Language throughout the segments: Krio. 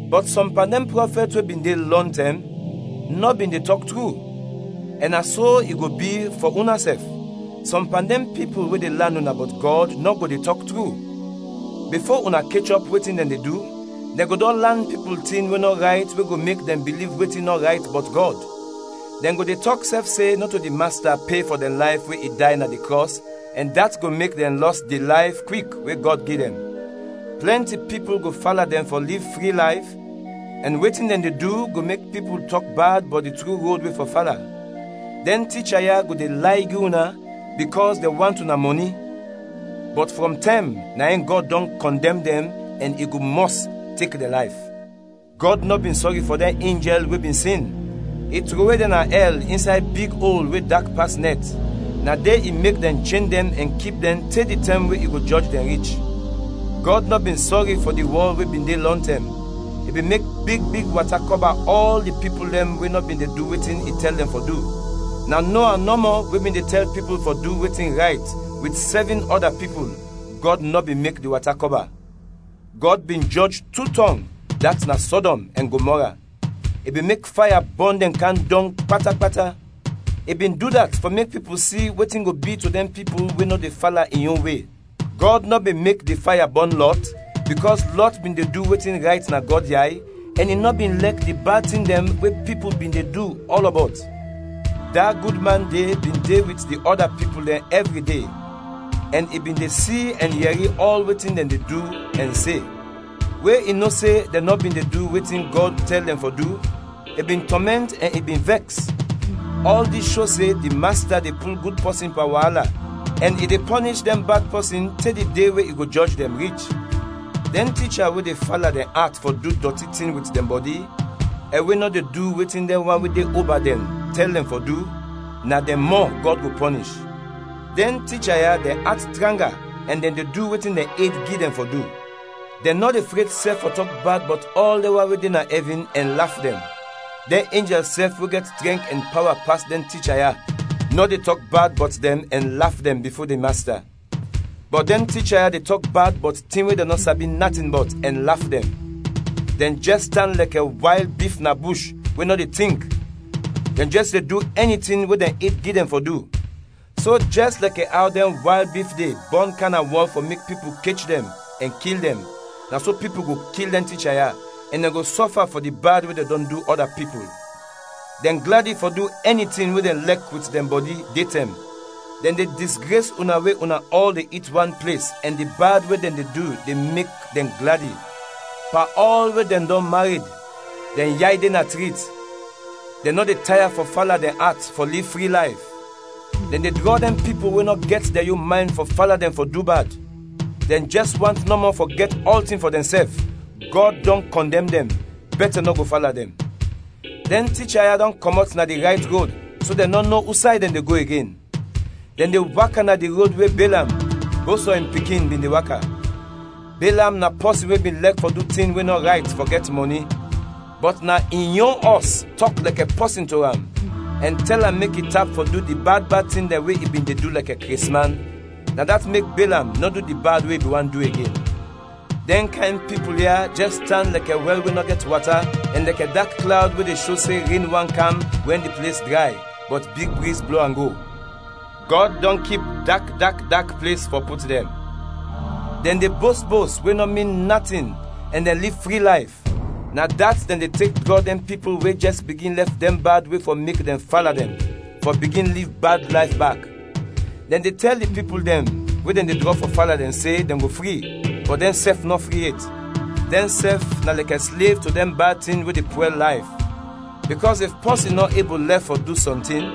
Bɔt sɔm pan dɛn prɔfɛt we bin de lɔntɛm, nɔ bin de tɔk tru; ɛn na so i go bi fɔ unasɛf; sɔm pan dɛn pipul we de lan una bɔt Gɔd nɔ go de tɔk tru; bifo una kechɔp wetin dɛn de du, dɛn go dɔn lan pipul tin we nɔ rayt we go mek dɛn biliv wetin nɔ rayt bɔt Gɔd; dɛn go de tɔk sɛf se nɔto di Masta pe fɔ dɛn layf we i day na di krɔs ɛn dat go mek dɛn lɔs di layf kwik we Gɔd gi dɛn. Plɛnti pipul go fala dɛn fɔ liv fri layf, ɛn wetin dɛn de du go mek pipul tɔk bad bɔt di tru rod we fɔ fala. Dɛn ticha ya go de lay gi una bikɔs dɛn want una mɔni; bɔt frɔm tɛm na in Gɔd dɔn kɔndɛm dɛn ɛn i go mɔs tek dɛn layf. Gɔd nɔ bin sɔri fɔ dɛn enjɛl we bin sin, i trowe dɛn na ɛl, insay big ol we dak pas nɛt, na de i mek dɛn chen dɛn ɛn kip dɛn te di tɛm we i go jɔj dɛn rich. Gɔd nɔ bin sɔri fɔ di wɔl we bin de lɔntɛm; i bin mek big big wata kɔba ɔl di pipul dɛn we nɔ bin de du wetin i tɛl dɛn fɔ du. Na Noa nɔmɔ we bin de tɛl pipul fɔ du wetin rayt wit sɛvin ɔda pipul, Gɔd nɔ bin mek di wata kɔba; Gɔd bin jɔj tu tɔng, dat na Sɔdɔm ɛn Gomɔra; i bin mek faya bɔn dɛn kam dɔng pata pata. I bin du dat fɔ mek pipul si wetin go bi to dɛn pipul we nɔ de fala in yon we. Gɔd nɔ bin mek di faya bɔn Lɔt bikɔs Lɔt bin de du wetin rayt na Gɔd yay ɛn i nɔ bin lɛk di bad tin dɛn we pipul bin de du ɔlɔbɔt. Da gud man de bin de wit di ɔda pipul dɛn ɛvri de, ɛn i bin de si ɛn yɛri ɔl wetin dɛn de du ɛn se. We i no se dɛn nɔ bin de du wetin Gɔd tɛl dɛn fɔ du, i bin tɔmɛnt ɛn i bin vɛks. Ɔl dis sho se di Masta de pul gud pɔsin pan waala ɛn i de pɔnish dɛn bad pɔsin te di de we i go jɔj dɛn, rich, dɛn ticha we de fala dɛn at fɔ du dɔti tin wit dɛn bɔdi ɛn we nɔ de du wetin dɛn wan we de oba dɛn tɛl dɛn fɔ du, na dɛn mɔ Gɔd go pɔnish. Dɛn ticha ya dɛn at tranga ɛn dɛn de du wetin dɛn ed gi dɛn fɔ du; dɛn nɔ de fred sɛf fɔ tɔk bad bɔt ɔl dɛn wan we de na ɛvin ɛn laf dɛn. Dɛn enjɛl sɛf we gɛt trɛnk ɛn pawa pas dɛn ticha ya nɔ de tɔk bad bɔt dɛn ɛn laf dɛn bifo di Masta. Bɔt dɛn ticha ya de tɔk bad bɔt tin we dɛn nɔ sabi natin bɔt, ɛn laf dɛn; dɛn jɛs tan lɛkɛ wayl bif na bush we nɔ de tink, dɛn jɛs de du ɛni tin we dɛn ed gi dɛn fɔ du; so jɛs lɛkɛ aw dɛn wayl bif de bɔn kam na wɔl fɔ mek pipul kech dɛn, ɛn kil dɛn, na so pipul go kil dɛn ticha ya, ɛn dɛn go sɔfa fɔ di bad we dɛn dɔn du ɔda pipul. Dɛn gladi fɔ du ɛni tin we dɛn lɛk wit dɛn bɔdi, de tɛm. Dɛn de disgres una we una ɔl de it wan ples ɛn di bad we dɛn de du de mek dɛn gladi. Pan ɔl we dɛn dɔn mared, dɛn yay de na trit, dɛn nɔ de taya fɔ fala dɛn at fɔ liv fri layf. Dɛn de drɔ dɛn pipul we nɔ gɛt dɛn yon maynd fɔ fala dɛn fɔ du bad. Dɛn jɛs want nɔmɔ fɔ gɛt ɔltin fɔ dɛnsɛf, Gɔd dɔn kɔndɛm dɛn, bɛtɛ nɔ go fala dɛn. Dɛn ticha ya dɔn kɔmɔt na di rayt rod so dɛn nɔ no usay dɛn de go igen. Dɛn de waka na di rod we Belam, Bosɔ in pikin, bin de waka; Belam na pɔsin we bin lɛk fɔ du tin we nɔ rayt, fɔ gɛt mɔni, bɔt na in yon ɔs tɔk lɛkɛ pɔsin to am ɛn tɛl am mek i tap fɔ du di bad bad tin dɛn we i bin de du lɛkɛ kresman; na dat mek Belam nɔ du di bad we i bin want du igen. Dɛn kayn pipul ya jɛs tan lɛkɛ wɛl we nɔ gɛt wata ɛn lɛkɛ dak klawd we de sho se ren want kam wɛn di ples dray, bɔt big briz blo am go. Gɔd dɔn kip dak dak dak ples fɔ put dɛn. Dɛn de bost bost we nɔ min natin ɛn dɛn liv fri layf; na dat dɛn de tek drɔ dɛn pipul we jɛs bigin lɛf dɛn bad we fɔ mek dɛn fala dɛn, fɔ bigin liv bad layf bak. Dɛn de tɛl di pipul dɛn we dɛn de drɔ fɔ fala dɛn, se dɛn go fri, bɔt dɛnsɛf nɔ fri yet, dɛnsɛf na lɛkɛ slev to dɛn bad tin we de pwɛl layf; bikɔs if pɔsin nɔ ebul lɛf fɔ du sɔntin,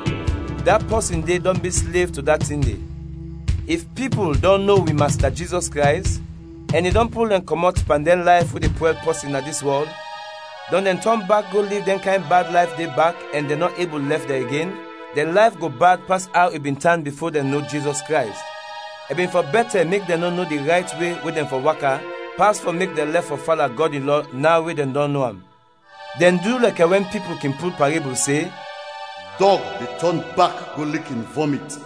da pɔsin de dɔn bi slev to da tin de. If pipul dɔn no wi Masta Jizɔs Krays, ɛn i dɔn pul dɛn kɔmɔt pan dɛn layf we de pwɛl pɔsin na dis wɔl, dɔn dɛn tɔn bak go liv dɛn kayn bad layf de bak ɛn dɛn nɔ ebul lɛf dɛn igen, dɛn layf go bad pas aw i bin tan bifo dɛn no Jizɔs Krays. I bin fɔ bɛtɛ mek dɛn nɔ no di rayt we we dɛn fɔ waka, pas fɔ mek dɛn lɛf fɔ fala Gɔd in lɔ, naw we dɛn dɔn no am. Dɛn du lɛkɛ wɛn pipul kin pul parebul se, “Dɔg de tɔn bak go lik in vɔmit,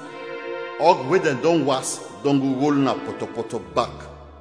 ɔg we dɛn dɔn was dɔn go rol na pɔtɔpɔtɔ bak.”